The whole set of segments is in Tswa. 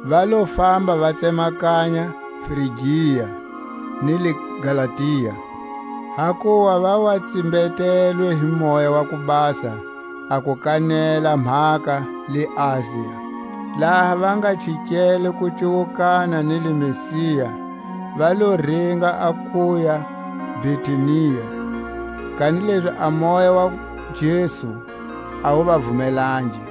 Va lo famba va tsemakanya Frigia ni le Galatia, hakuva va wa tsimbetelwe hi Moya wa ku Basa a ku kanela mhaka le Asia. Laha va nga chikele ku cuwukana ni le Misia, va lo ringa a kuya Bitunia; kanilezi a Moya wa Jesu a wu va vumelangi.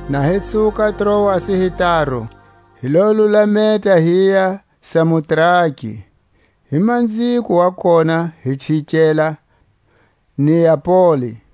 Na hi suka Troasi hi taru, hi lo lulameta hiya Samotrake, hi manziko wa kona hi chikela Neapoli.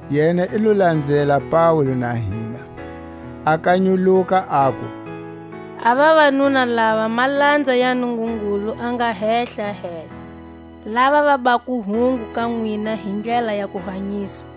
Yena i lo lanzela Paule na hina, a kanyuluka aku: A vavanuna lava malanza ya Nungungulu a nga Hehlahehla, lava va bako hungu ka nwina hi ndlela ya kuhanyiswa.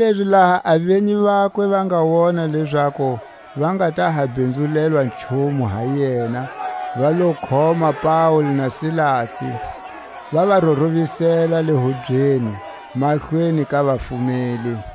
Kanilezi laha a venyi vakwe va nga wona lezaku va nga ta ha bhinzula nchumu ha yena va lo khoma Paule na Silasi, va ya rorovisela le hubyeni mahlweni ka vafumeli.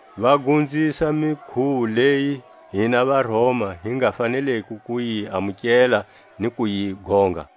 va gonzisa mikhuwo leyi hina vaRoma hi nga faneliko ku yi amukela ni ku yi gonga.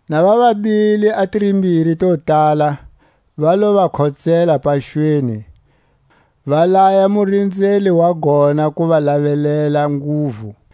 Na va va bile a tirimbiri to tala, va lo va khotsela paxweni, va laya murinzeli wa gona ku va lavelela nguvu.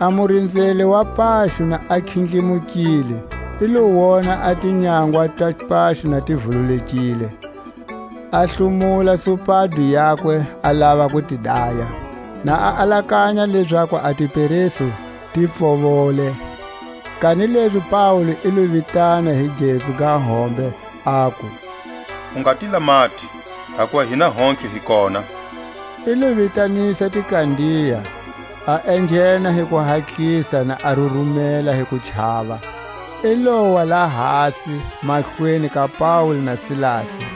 A murinzeli wa paxo na a khindlimukile, i lo wona a tinyangwa ta paxo na ti vululekile, a hlomula supado yakwe a lava ku ti daya, na a alakanya lezaku a tiperesu ti pfovole. Kanilezi Paule i lo vitana hi gezu ga hombe, aku: U nga ti lamati, hakuva hina hontlhe hi kona. I lo vitanisa tikandiya, a enghena hi kuhatlisa na a rurumela hi kuchava, i lowa lahasi mahlweni ka Paule na Silasi,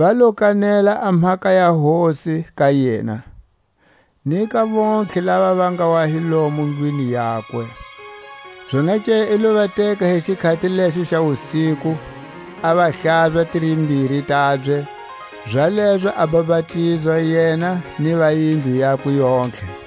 Va lo kanela a mhaka ya Hosi ka yena, ni ka vontlhe lava va nga wa hi lomo ndlwini yakwe. Zonake i lo va teka hi xikhati lexo xa wusiku, a va hlaza a tirimbiri tabye, zalezo a bapatizwa yena ni va yindlu yakwe yontlhe.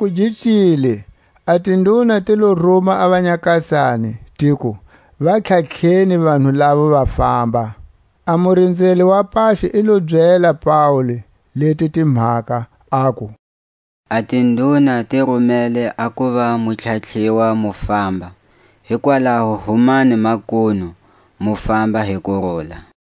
Loku gi cile, a tinduna ti lo ruma a vanyakasani, tiku: Va tlhatlheni vanhu lavo va famba. A murinzeli wa paxo i lo byela Paule leti timhaka, aku: A tinduna ti rumele a kuva mu tlhatlhiwa mu famba; hikwalaho humani makunu, mu famba hi kurula.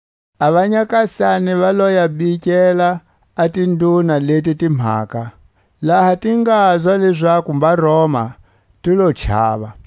A vanyakasani va lo ya bikela a tinduna leti timhaka; laha ti ngazwa lezaku mbaRoma ti lo chava;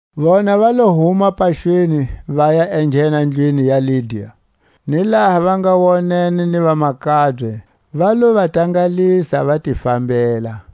Vona va lo huma paxweni, vaya enghena ndlwini ya Lidia; ni laha va nga wonene ni vamakabye, va lo va tangalisa, va ti fambela.